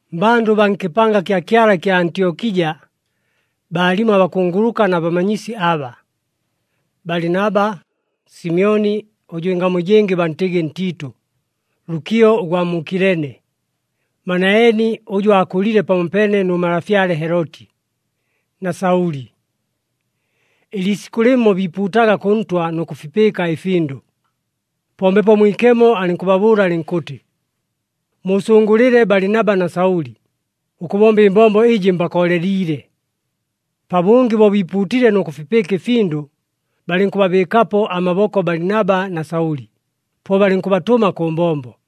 Mmbandʉ baa nkɨpanga kya Kyala ɨkya Antyokija baalimo abakunguluka na bamanyisi aba: Balinaba, Simyoni ʉjʉ ɨngamu ɨjɨngɨ bantɨgɨ Ntiitʉ, Lukio ʉgwa mu Kilene, Manaeni ʉjʉ aakʉlile pamopeene nʉ malafyale Heloti, na Saʉli. Ɨliisikʉ lɨmo biipuutaga kʉ Ntwa nʉ kʉfipɨɨka ɨfindʉ. Po Mbepo Mwikemo alɨnkʉbabʉʉla alɨnkʉtɨ, “Muusʉngʉlɨle Balinaba na Saʉli, ʉkʉbomba ɨmbombo ɨjɨ mbakooleliile.” Pabʉngɨ bo biipuutile nʉ kʉfipɨɨka ɨfindʉ, balɨnkʉbabɨɨkapo amaboko Balinaba na Saʉli, po balɨnkʉbatʉma kʉ mbombo.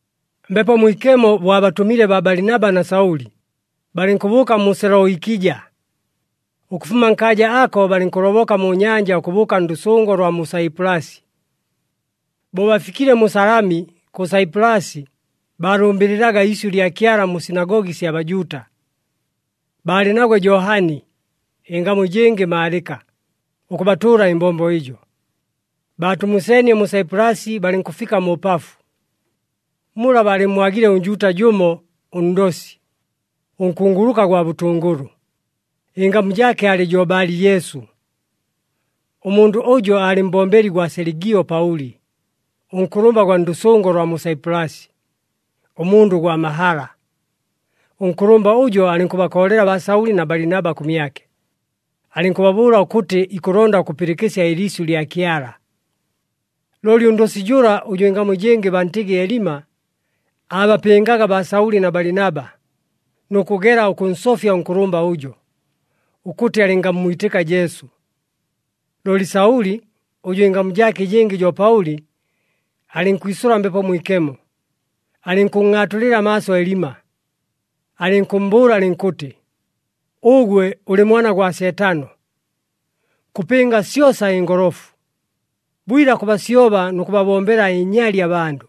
Mbepo Mwikemo bo abatʉmile baa Balinaba na Saʉli, balɨnkʉbʉʉka mu Seloikija. Ʉkʉfuma nkaaja ako, balɨnkʉloboka mu nyanja ʉkʉbʉʉka ndʉsʉngo lwa mu Saipulasi. Bo bafikile mu Salami kʉ Saipulasi, baalʉmbɨlɨlaga iisyʉ lya Kyala mu sinagogi sya Bajuuta. Baalɨ nagwe Johani, ɨngamu ɨjɨngɨ Maalɨka, ʉkʉbatʉʉla ɨmbombo ɨjo. Baatumuseenie mu Saipulasi, balɨnkʉfika mu Pafu. Mula baalɨmmwagile ʉNjuuta jʉmo, ʉndosi, ʉnkunguluka gwa bʉtʉngʉlʉ, ɨngamu jaake aalɨ jo Bali-Jesu. Ʉmundʉ ʉjo aalɨ mbombeli gwa Seligio Paʉli, ʉnkʉlʉmba gwa ndʉsʉngo lwa mu Saipulasi, ʉmundʉ gwa mahala. Ʉnkʉlʉmba ʉjo alɨnkʉbakoolela baa Saʉli na Balinaba kʉmyake, alɨnkʉbabʉʉla ʉkʉtɨ ikʉlonda ʉkʉpɨlɨkɨsya ɨliisyʉ lya Kyala. Looli ʉndosi jʉla, ʉjʉ ɨngamu ɨjɨngɨ bantɨgɨ Elima, aabapɨngaga baa Saʉli na Balinaba, nʉ kʉgela ʉkʉnsofya ʉnkʉlʉmba ʉjo, ʉkʉtɨ alɨngammwitɨka Jesu. Looli Saʉli, ʉjʉ ɨngamu jaake ɨjɨngɨ jo Paʉli, alɨnkwisʉla Mbepo Mwikemo, alɨnkʉnngʼaatulɨla amaaso Elima. Alɨnkʉmmbʉʉla alɨnkʉtɨ, “Ʉgwe ʉlɨ mwana gwa Seetano, kʉpɨnga syosa ɨngolofu! Bwila kʉbasyoba nʉ kʉbabombela ɨnyali abandʉ.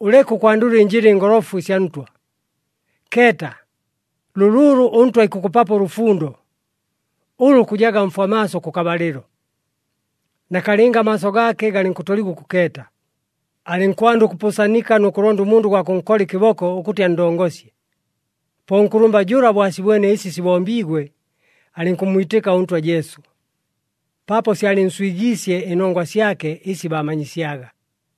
Ʉleke ʉkwandʉla ɨnjɨla ɨngolofu ɨsya Ntwa! Keeta! Lʉlʉʉlʉ ʉNtwa ikʉkʉpapo ʉlʉfundo, ʉlʉ kʉjaga mfwa maaso, kʉkabalɨlo.” Nakalɨnga amaaso gaake galɨnkʉtoligwa ʉkʉkeeta, alɨnkwanda ʉkʉpʉʉsanika nʉ kʉlonda ʉmundʉ gwa kʉnkola ɨkɨboko ʉkʉtɨ anndongosye. Po ʉnkʉlʉmba jʉla bo asibwene ɨsi sibombiigwe, alɨnkʉmmwitɨka ʉNtwa Jesu, paapo syalɨnswigiisye ɨnongwa syake ɨsi baamanyisyaga.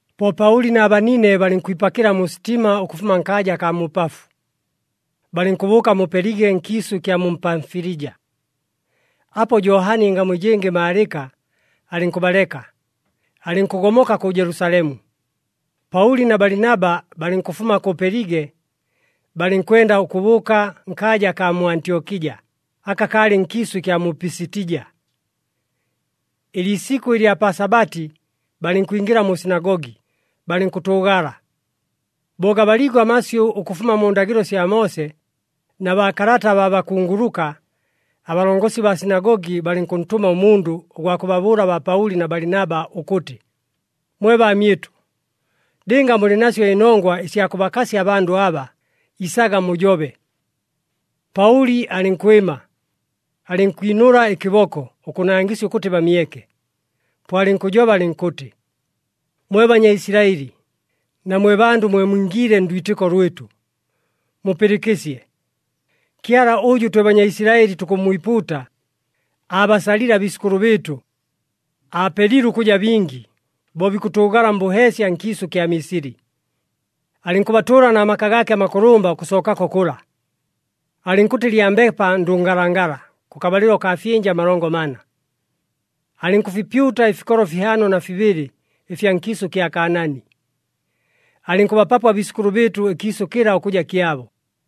Po Paʉli na banine balɨnkwipakɨla mu sitima ʉkʉfuma nkaaja akaa mu Pafu, balɨnkʉbʉʉka mu Pelige nkiisʉ ɨkya mu Pamfilija. Apo Johani, ɨngamu ɨjɨngɨ Maalɨka, alɨnkʉbaleka, alɨnkʉgomoka kʉ Jelusalemu. Paʉli na Balinaba balɨnkʉfuma kʉ Pelige, balɨnkwenda ʉkʉbʉʉka nkaaja akaa mu Antyokija, aka kalɨ nkiisʉ ɨkya mu Pisitija. Ɨliisikʉ ɨlya pa Sabati balɨnkwingɨla mu sinagogi, balɨnkʉtʉʉgala. Bo gabaliigwe amasyʉ ʉkʉfuma mu ndagɨlo sya Moose na baakalata abaa bakunguluka, abalongosi baa sinagogi balɨnkʉntʉma ʉmundʉ ʉgwa kʉbabʉʉla baa Paʉli na Balinaba ʉkʉtɨ, “Mwe baamyɨtʉ, lɨnga mulɨ nasyo ɨnongwa ɨsya kʉbakasya abandʉ aba, isaga mujobe.” Paʉli alɨnkwɨma, alɨnkwinʉla ɨkɨboko ʉkʉnangɨsya ʉkʉtɨ bamyeke, po alɨnkʉjoba alɨnkʉtɨ, “Mwe Banyaisilaɨli, na mwe bandʉ mwe mwingiile ndwitɨko lwɨtʉ, mupɨlɨkɨsye! Kyala ʉjʉ twe Banyaisilaɨli tukʉmmwipuuta, aabasalile abiisʉkʉlʉ bɨɨtʉ, aapelile ʉkʉja bingi, bo bikʉtʉʉgala mbʉheesya nkiisʉ kya Misili. Alɨnkʉbatʉʉla na maka gaake amakʉlʉmba ʉkʉsookako kʉla. Alɨnkʉtɨ lyambepa ndʉngalangala, kʉkabalɨlo kaa fyɨnja amalongo mana. Alɨnkʉfipyuta ɨfikolo fihaano na fibɨlɨ ɨfya nkiisʉ kya Kaanaani, alɨnkʉbapapo abiisʉkʉlʉ bɨɨtʉ ɨkiisʉ kɨla ʉkʉja kyabo.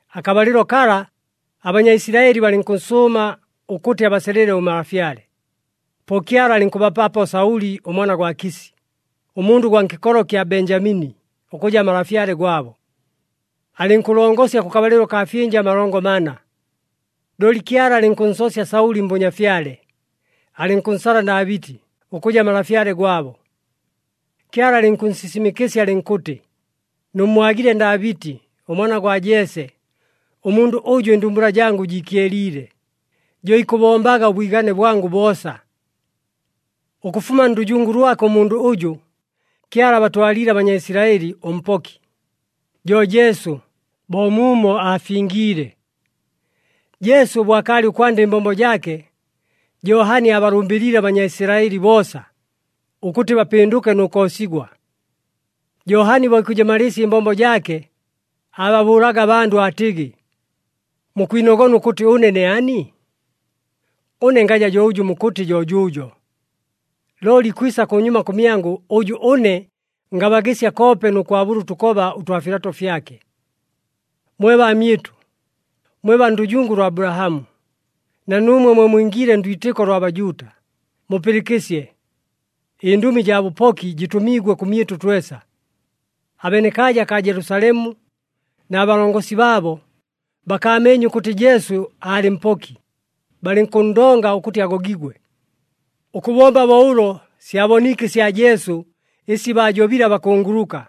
Akabalɨlo kala, aBanyaisilaɨli balɨnkʉnsʉʉma ʉkʉtɨ abasalɨle ʉmalafyale. Po Kyala alɨnkʉbapapo Saʉli ʉmwana gwa Kisi, ʉmundʉ gwa nkɨkolo kya Benjamini, ʉkʉja malafyale gwabo. Alɨnkʉlongosya kʉkabalɨlo kaa fyɨnja amalongo mana. Looli Kyala alɨnkʉnsoosya Saʉli mbʉnyafyale, alɨnkʉnsala Ndaabɨti ʉkʉja malafyale gwabo. Kyala alɨnkʉnsisimɨkɨsya, alɨnkʉtɨ, ‘Nʉmmwagile Ndaabɨti ʉmwana gwa Jese, ʉmundʉ ʉjʉ ɨndumbula jangʉ jiikyeliile, jo ikʉbombaga ʉbwigane bwangʉ boosa.’ “Ʉkʉfuma ndʉjungu lwake ʉmundʉ ʉjʉ, Kyala abatwaliile aBanyaisilaɨli ʉMpoki, jo Jesu, bo muumo aafingiile. Jesu bo akaalɨ ʉkwanda ɨmbombo jaake, Johani aabalʉmbɨliile aBanyaisilaɨli boosa, ʉkʉtɨ bapɨndʉke nʉ koosigwa. Johani bo ikʉjɨmalɨɨsya ɨmbombo jaake, aababʉʉlaga abandʉ aatɨgɨ, ‘Mukwinogona ʉkʉtɨ ʉne ne ani? Ʉne ngaja jo ʉjʉ mukʉtɨ, jo jʉʉjo! Looli ikwisa kʉnyuma kʉmyangʉ, ʉjʉ ʉne ngabagɨsya koope nʉ kwabʉla ʉtʉkoba ʉtwa filato fyake.’ “Mwe baamyɨtʉ, mwe baa ndʉjungu lwa Abulahamu, na nuumwe mwe mwingiile ndwitɨko lwa Bajuuta, mupɨlɨkɨsye. Ɨndʉmi jaa bʉpoki jɨtʉmiigwe kʉmyɨtʉ twesa. Abenekaaja kaa Jelusalemu, na balongosi baabo, bakaameenye ʉkʉtɨ Jesu aalɨ Mpoki, balɨnkʉnndonga ʉkʉtɨ agogigwe. Ʉkʉbomba bo ʉlo syaboniike ɨsya Jesu ɨsi baajobile abakunguluka,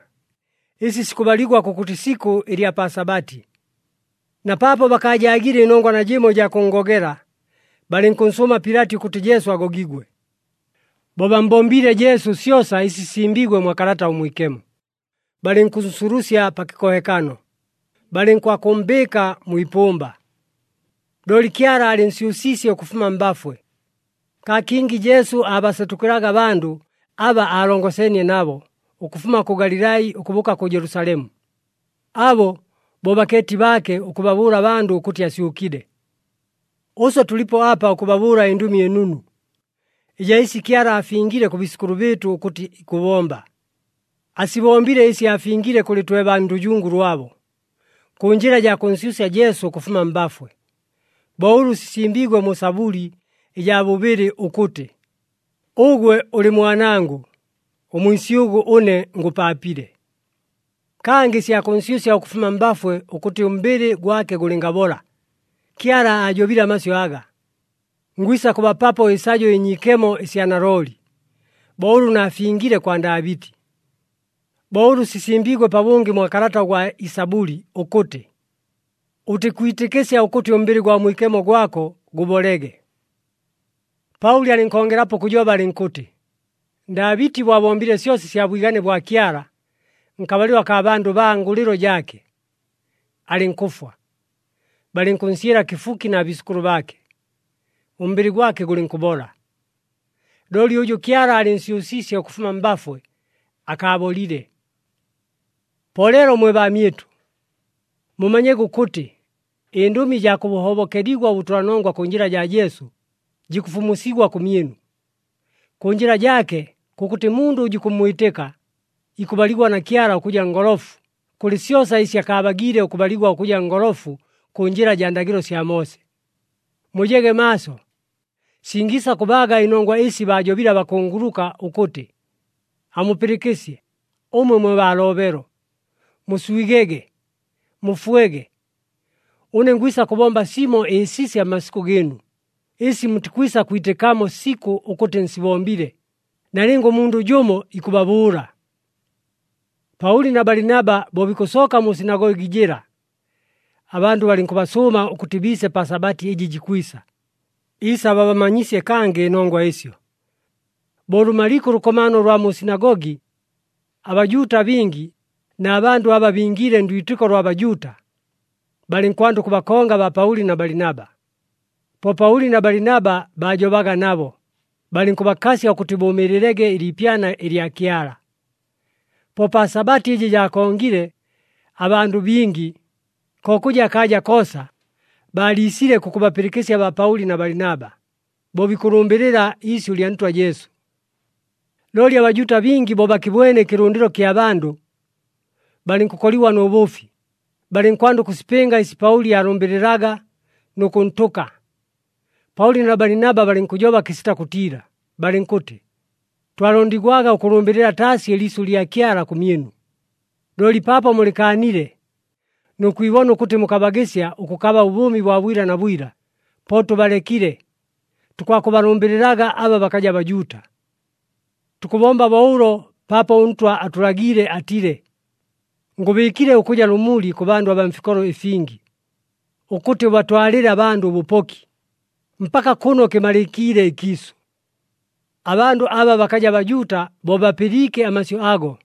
ɨsi sikʉbaligwa kʉkʉtɨ isikʉ ɨlya pa Sabati. Na paapo bakaajaagile ɨnongwa najɨmo ɨjaa kʉnngogela, balɨnkʉnsʉʉma Pilati ʉkʉtɨ Jesu agogigwe. Bo bammbombiile Jesu syosa ɨsi sisimbiigwe mwa Kalata ʉMwikemo, balɨnkʉnsulusya pa kɨkohekano, balɨnkwakʉmmbɨɨka mwi ipʉmba. Looli Kyala aalɨnsyʉsiisye ʉkʉfuma mbafwe. Kaa kingi Jesu aabasetʉkɨlaga abandʉ aba aalongeseenie nabo, ʉkʉfuma kʉ Galilai ʉkʉbʉʉka kʉ Jelusalemu. Abo bo bakeeti baake, ʉkʉbabʉʉla abandʉ ʉkʉtɨ asyʉkile. “Ʉswe tʉlipo apa ʉkʉbabʉʉla ɨNdʉmi ɨNunu, ɨjaa ɨsi Kyala aafingile kʉ biisʉkʉlʉ bɨɨtʉ ʉkʉtɨ ikʉbomba. Asibombile ɨsi aafingile kʉlɨ twe baa ndʉjungu lwabo, kʉ njɨla jaa kʉnsyʉsya Jesu ʉkʉfuma mbafwe, bo ʉlʉ sisimbiigwe mu Sabʉli ɨjaa bʉbɨlɨ ʉkʉtɨ, ‘Ʉgwe ʉlɨ Mwanangʉ, ʉmwisyʉgʉ ʉne ngʉpaapile.’ “Kangɨ ɨsya kʉnsyʉsya ʉkʉfuma mbafwe, ʉkʉtɨ ʉmbɨlɨ gwake gʉlɨngabola, Kyala aajobile amasyʉ aga, ‘Ngwisa kʉbapapo ɨsajo ɨnyiikemo ɨsya nalooli, bo ʉlʉ naafingile kwa Ndaabɨti.’ “Bo ʉlʉ sisimbiigwe pabʉngɨ mwa kalata gwa Ɨsabʉli ʉkʉtɨ, ‘Ʉtikwitɨkɨsya ʉkʉtɨ ʉmbɨlɨ gwa Mwikemo gwako gʉbolege.’” Paʉli alɨnkongelapo ʉkʉjoba alɨnkʉtɨ, “Ndaabɨti bo abombile syosa ɨsya bwigane bwa Kyala nkabalɨlo akaa bandʉ baa ngʉlɨlo jaake, alɨnkʉfwa, balɨnkʉnsyɨla kɨfuki na biisʉkʉlʉ baake, ʉmbɨlɨ gwake gʉlɨnkʉbola. Looli ʉjʉ Kyala aalɨnsyʉsiisye ʉkʉfuma mbafwe akaabolile. “Po leelo mwe baamyɨtʉ, mumanyege ʉkʉtɨ, ɨndʉmi ɨjaa kʉhobokeligwa ʉbʉtʉlanongwa kʉ njɨla jaa Jesu, jikʉfumusigwa kʉmyɨnu. Kʉ njɨla jaake, kʉkʉtɨ mundʉ ʉjʉ ikʉmmwitɨka, ikʉbaligwa na Kyala ʉkʉja ngolofu kʉlɨ syosa ɨsi akaabagiile ʉkʉbaligwa ʉkʉja ngolofu kʉ njɨla jaa ndagɨlo sya Moose. Mujege maaso, singiisa kʉbaaga ɨnongwa ɨsi baajobile abakunguluka ʉkʉtɨ, ‘Amupɨlɨkɨsye ʉmwe mwe baa loobelo, muswigege, mufwege. Ʉne ngwisa kʉbomba simo ɨsisya mmasikʉ gɨɨnu, ɨsi mutikwisa kwitɨkamo sikʉ ʉkʉtɨ nsibombile, nalɨnga ʉmundʉ jʉmo ikʉbabʉʉla!’” Paʉli na Balinaba bo bikʉsooka mu sinagogi jɨla, abandʉ balɨnkʉbasʉʉma ʉkʉtɨ biise pa Sabati ɨjɨ jikwisa, isababamanyisye kangɨ ɨnongwa ɨsyo. Bo lʉmaliike ʉlʉkomaano ʉlwa mu sinagogi, aBajuuta abingi na bandʉ aba bingiile ndwitɨko lwa Bajuuta, balɨnkwanda ʉkʉbakonga baa Paʉli na Balinaba. Po Paʉli na Balinaba, baajobaga nabo, balɨnkʉbakasya ʉkʉtɨ, bʉʉmɨɨlɨlege ɨliipyana ɨlya Kyala. Po pa Sabati ɨjɨ jaakongile, abandʉ bingi, ko kʉja akaaja koosa, baaliisile kʉkʉbapɨlɨkɨsya baa Paʉli na Balinaba, bo bikʉlʉmbɨlɨla iisyʉ lya Ntwa Jesu. Looli aBajuuta bingi bo bakɨbwene ɨkɨlʉndɨlo kya bandʉ, balɨnkʉkoligwa nʉ bʉʉfi, balɨnkwanda ʉkʉsipɨnga ɨsi Paʉli aalʉmbɨlɨlaga, nʉ kʉntʉka. Paʉli na Balinaba balɨnkʉjoba kɨsita kʉtiila, balɨnkʉtɨ, “Twalondigwaga ʉkʉlʉmbɨlɨla taasi ɨliisyʉ lya Kyala kʉmyɨnu. Looli paapo mulɨkaanile, nʉ kwibona ʉkʉtɨ mukabagɨsya ʉkʉkaba ʉbʉʉmi bwa bwila na bwila, po tʉbalekile, tukwakʉbalʉmbɨlɨlaga aba bakaja Bajuuta. Tukʉbomba bo ʉlo paapo ʉNtwa atʉlagiile atile, ‘Ngʉbɨɨkile ʉkʉja lʉmuli kʉ bandʉ abaa mfikolo ɨfingi, ʉkʉtɨ ʉbatwalɨle abandʉ ʉbʉpoki, mpaka kʉno kɨmalɨkiile ɨkiisʉ.’” Abandʉ aba bakaja Bajuuta bo bapɨliike amasyʉ ago,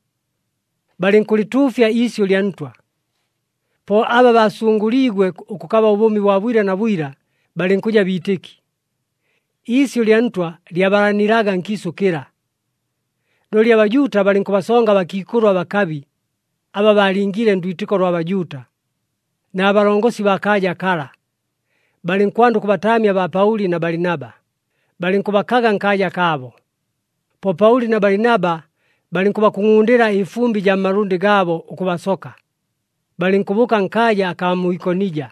balɨnkʉlɨtuufya iisyʉ lya Ntwa. Po aba baasʉngʉliigwe ʉkʉkaba ʉbʉʉmi bwa bwila na bwila, balɨnkʉja biitɨki. Iisyʉ lya Ntwa lyabalanilaga nkiisʉ kɨla. Looli aBajuuta balɨnkʉbasonga abakiikʉlʉ abakabi aba baalingiile ndwitɨko lwa Bajuuta, na balongosi baa kaaja kala. Balɨnkwanda ʉkʉbataamya baa Paʉli na Balinaba, balɨnkʉbakaga nkaaja kaabo. Po Paʉli na Balinaba balɨnkʉbakungʼundɨla ɨfumbɨ jaa mmalʉndɨ gaabo ʉkʉbasoka, balɨnkʉbʉʉka nkaaja akaa mu Ikonija.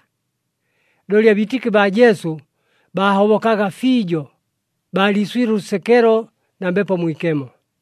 Looli abiitɨki baa Jesu baahobokaga fiijo, baaliiswile ʉlʉsekelo na Mbepo Mwikemo.